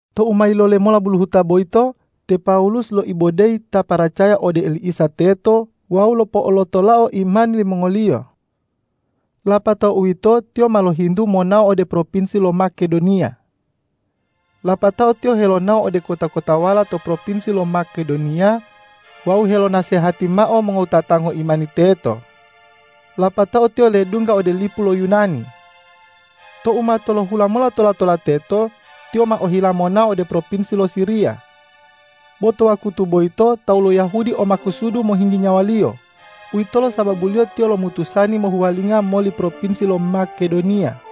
Tou ma yilole mota buluhuta boyito, te Pawulus loibodeyi ta paracaya ode oli Isa teto wawu lopo'olotolao imani limongoliyo. Lapatao uwito tiyo ma lohintu monao ode propinsi lo Makedoniya. Lapatao tiyo helonao ode kota-kotawala to propinsi lo Makedoniya wawu helonasehati mao mongowutata ngoimani teto. Lapatao tiyo ledungga ode lipu lo Yunani. Tou ma tolohula mola tola-tola teto, tiyo ma ohila monao ode propinsi lo Siriya. Bo to wakutu boyito tawu lo Yahudi o makusudu mohinggi nyawaliyo. Uwitolo sababuliyo tiyo lomutusani mohuwalinga moli propinsi lo Makedoniya.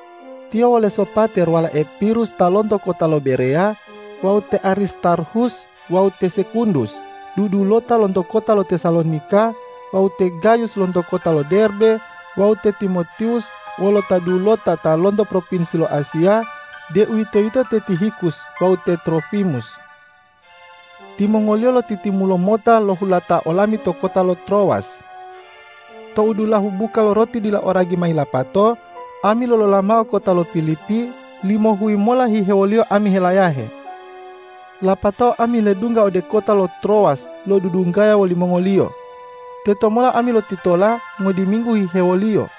Tiyo wole Sopater walae Pirus ta lonto kota lo Bereya, wawu te Aristarhus wawu te Sekundus, dudulota lonto kota lo Tesalonika, wawu te Gayus lonto kota lo Derbe, wawu te Timotiwus wolo ta dulota ta lonto propinsi lo Asiya, deuwitoyito te Tihikus wawu te Trofimus. Timongoliyo lotitimulo mota lohulata olami to kota lo Trowas. Tou dulahu buka lo roti dila o ragi ma yilapato, ami lolola mao kota lo Pilipi limohuyi mola hihewoliyo ami helayahe. Lapatao ami ledungga ode kota lo Trowas lodudunggaya wolimongoliyo. Tetomola ami lotitola ngodiminggu hihewoliyo.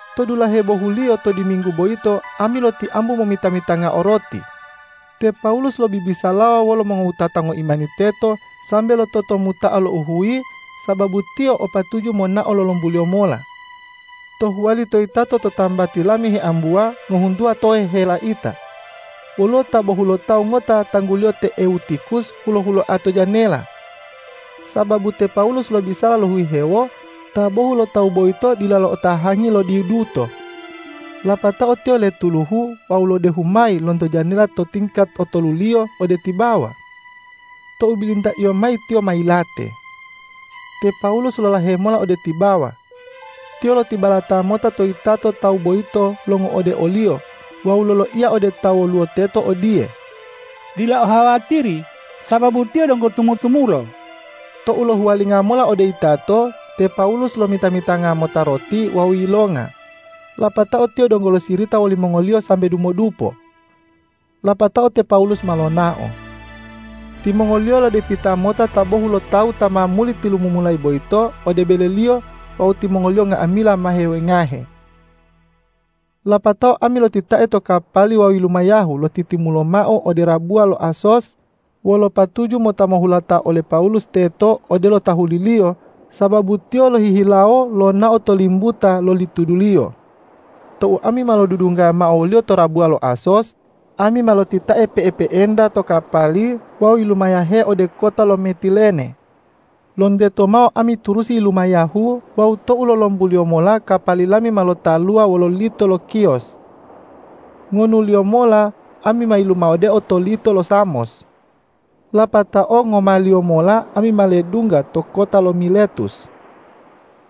To dulahe bohuliyo to diminggu boyito ami lotiambu momita-mitangao roti. Te Pawulus lobibisalawa wolo mongowutata ngoimani teto sambe lototomuta'a louhuyi, sababu tiyo o patuju monao lolombuliyo mola. To huwali to yitato to tambati lami heambuwa ngohuntuwa tohe helaita. Woluwo ta bohulotawu ngota tangguliyo te Ewutikhus hulo-huloa to janela. Sababu te Pawulus lobisala lohihewo, ta bohulotawu boyito dila lo'otahangi lo diduto. Lapatao tiyo letuluhu wawu lodehu mayi lonto janela to tingkat otoluliyo ode tibawa. Tou bilintaiyo mayi tiyo ma yilate. Te Pawulus lolahe mola ode tibawa. Tiyo lotibalata mota to yitato tawu boyito longo'ode oliyo wawu loloiya ode ta woluwo teto odiye,”Dila ohawatiri, sababu tiyo donggo tumu-tumulo!” Tou lohuwalinga mola ode yitato, te Pawulus lomita-mitanga mota roti wawu yilonga. Lapatao tiyo donggo losirita wolimongoliyo sambe dumodupo. Lapatao te Pawulus ma lonao. Timongoliyo lodepita mota ta bohulotawu ta ma muli tilumumulayi boyito ode beleliyo wawu timongoliyo nga'amila ma hewengahe. Lapatao ami lotitae to kapali wawu yilumayahu lotitimulo mao ode rabuwa lo Asos, wolo patuju mota mohulata ole Pawulus teto odelo tahuliliyo, sababu tiyo lohihilawo lonao to limbuta loli tuduliyo. Tou ami ma lodudunggaya mao woliyo to rabuwa lo Asos, ami ma lotitae pe'epe'enta to kapali wawu yilumayahe ode kota lo Metilene. Lonteto mao ami turusi yilumayahu wawu tou lolombuliyo mola kapali lami ma lotaluwa wolo lito lo Khios. Ngonuliyo mola ami ma yilumawodeo to lito lo Samos. Lapatao ngomaliyo mola ami ma ledungga to kota lo Miletus.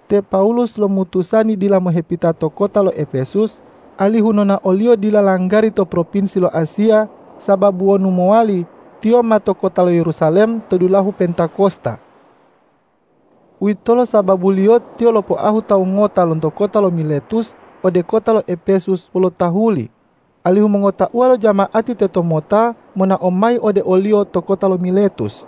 Te Pawulus lomutusani dila mohepita to kota lo Epesus, alihu nonaoliyo dila langgari to propinsi lo Asiya, sababu wonu mowali, tiyo ma to kota lo Yerusalem to dulahu Pentakosta. Uwitolo sababuliyo tiyo lopoahu tawu ngota lonto kota lo Miletus ode kota lo Epesus wolo tahuli, alihu mongotauwa lo jama'ati tetomota monao mayi ode oliyo to kota lo Miletus.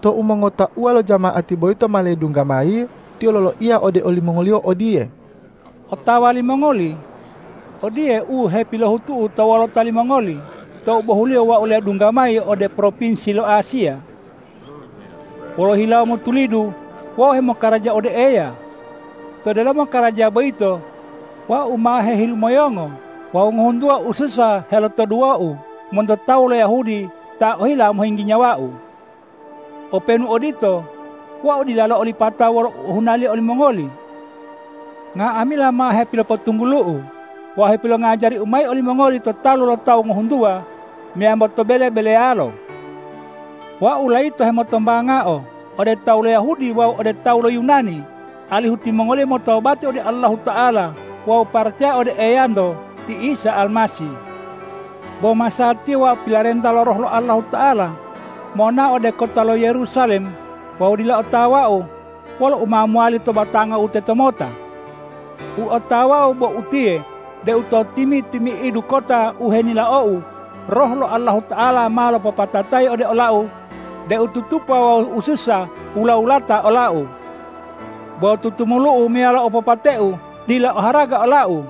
Tou mongotauwa lo jama'ati boyito ma ledungga mayi, tiyo loloiya ode olimongoliyo odiye,”Otawa limongoli, odiye u hepilohutu'u to wolota limongoli tou bohuliyo wau ledungga mayi ode propinsi lo Asiya. Wolo hilawo motulidu wau hemokaraja ode Eya. To delomo karaja boyito wau ma hehilumoyongo wawu ngohuntuwa ususa helotoduwou monto tawu lo Yahudi ta ohila mohinggi nyawau. Openu odito, wau dila lo'olipata wolo u ohunaliyo olimongoli. Nga'amila ma hepilopotunggulu'u wawu hepilongajariu mayi olimongoli to talu lo tawu ngohuntuwa meyambo to bele-beleyalo. Wau layito hemotombangao ode tawu lo Yahudi wawu ode tawu lo Yunani, alihu timongoliyo motobati ode Allahuta'ala wawu paracaya ode Eyanto, ti Isa Almasih. Bo masatiya wau pilarenta lo Roh lo Allahuta'ala monao ode kota lo Yerusalem wawu dila otawau wolo u ma mowali to batangau tetomota. U otawau bo utiye deu to timi-timi'idu kota u henilaou, Roh lo Allahuta'ala ma lopopatatayi ode olau deu tutupa wawu ususa wula-wulata olau. Bo tutumulu'u meyalo opopateu dila oharaga olau.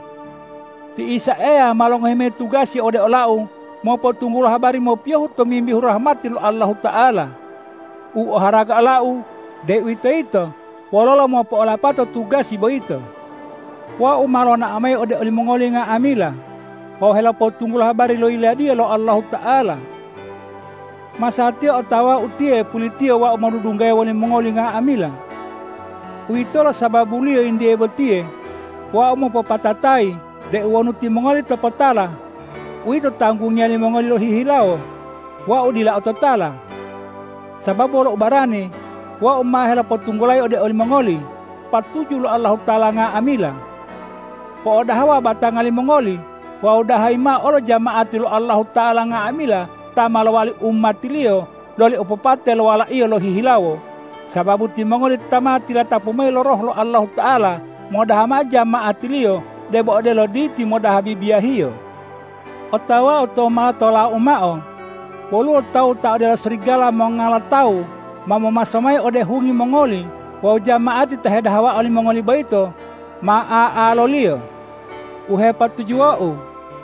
Ti Isa Eya ma longohi mayi tugasi ode olau mopotunggulo habari mopiyohu tomimbihu rahmati lo Allahuta'ala. U oharaga olau, deuwitoyito wololo mopo'olapatao tugasi boyito. Wau ma lonao mayi ode olimongoli nga'amila wawu helopotunggulo habari lo Yiladiya lo Allahuta'ala. Masatiya otawau utiye pulitiyo wau modudunggaya wolimongoli nga'amila. Uwitolo sababuliyo yintiye botiye wau mopopatatayi deu wonu timongoli topotala, uwito tanggungiya limongoli lohihilawo; wau dila ototala. Sababu wolo ubarani wau ma helopotunggulayi ode olimongoli patuju lo Allahuta'ala nga'amila. Po'odahawa batanga limongoli wawu dahayi mao olo jama'ati lo Allahuta'ala nga'amila ta ma lowali umati-Liyo loli opopate lo Wala-Iyo lohihilawo, sababu timongoli ta ma tilatapu mayi lo Roh lo Allahuta'ala modaha mao jama'ati-Liyo debo odelo diti modaha bibiyahiyo. Otawau tou ma tolau mao, woluwo tawu ta odelo serigala mongala tawu ma momaso mayi ode hungi mongoli wawu jama'ati ta hedahawa olimongoli boyito ma a'aloliyo. U hepatujuwou,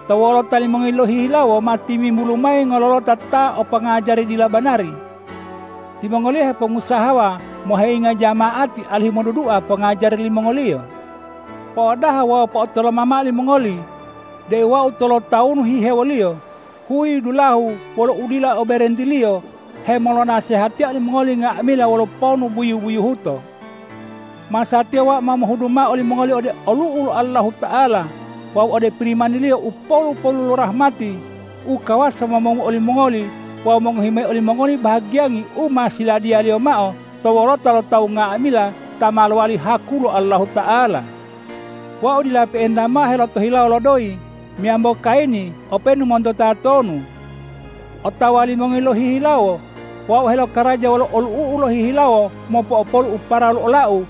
to wolota limongoli lohihilawo ma timimbulu mayi ngololota ta o pongajari dila banari. Timongoliyo hepongusahawa moheyinga jama'ati alihu modudua pongajari limongoliyo. Po'odaha wawu po'otoloma mao limongoli deu wau tolotawunu hihewoliyo, huyi dulahu wolo udila o berentiliyo hemolonasehatiya olimongoli nga'amila wolo ponu buyu-buyuhuto. Masatiya wau ma mohudu mao olimongoli ode olu'u lo Allahuta'ala wawu ode Pirimani-Liyo u polu-polu lo rahmati u kawasa momongu olimongoli wawu mongohi mayi olimongoli bahagiyangi u ma siladiya-Liyo mao to wolota lo tawu nga'amila ta ma lowali haku lo Allahuta'ala. Wau dila pe'enta mao helotohilawo lo doyi meyambo kayini openu monto tatonu. Otawa limongoli lohihilawo, wau helokaraja wolo olu'u'u lohihilawo mopo'opolu u paralu olau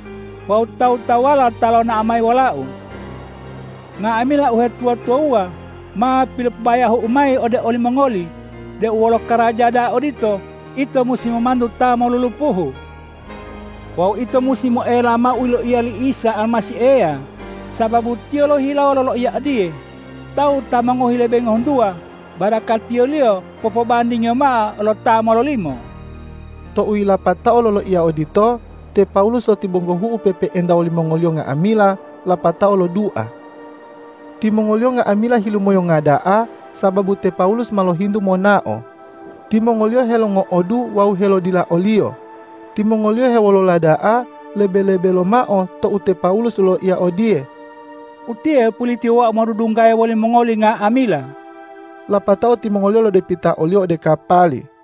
wawu tawu-tawuwala ta lonao mayi wolau. Nga'amila uhetuwa-tuwawuwa ma pilopobayahu'u mayi ode olimongoli deu wolo karaja da'a odito, ito musi momantu ta molulupuhu. Wawu ito musi moela mao u yiloiya li Isa Almasih Eya, sababu Tiyo lohihilawo loloiya odiye, ’Tawu ta mongohi lebe ngohuntuwa barakatiliyo popobandingiyo mao lo ta mololimo.’” Tou yilapatao loloiya odito, te Pawulus lotibonggohu'u pe'epe'enta wolimongoliyo nga'amila lapatao lodua. Timongoliyo nga'amila hilumoyonga da'a, sababu te Pawulus ma lohintu monao. Timongoliyo helongo'odu wawu helodila oliyo. Timongoliyo hewolola da'a, lebe-lebe lomao tou te Pawulus loloiya odiye,”Utiye pulitiyo wau modunggaya wolimongoli nga'amila.” Lapatao timongoliyo lodepita oliyo ode kapali.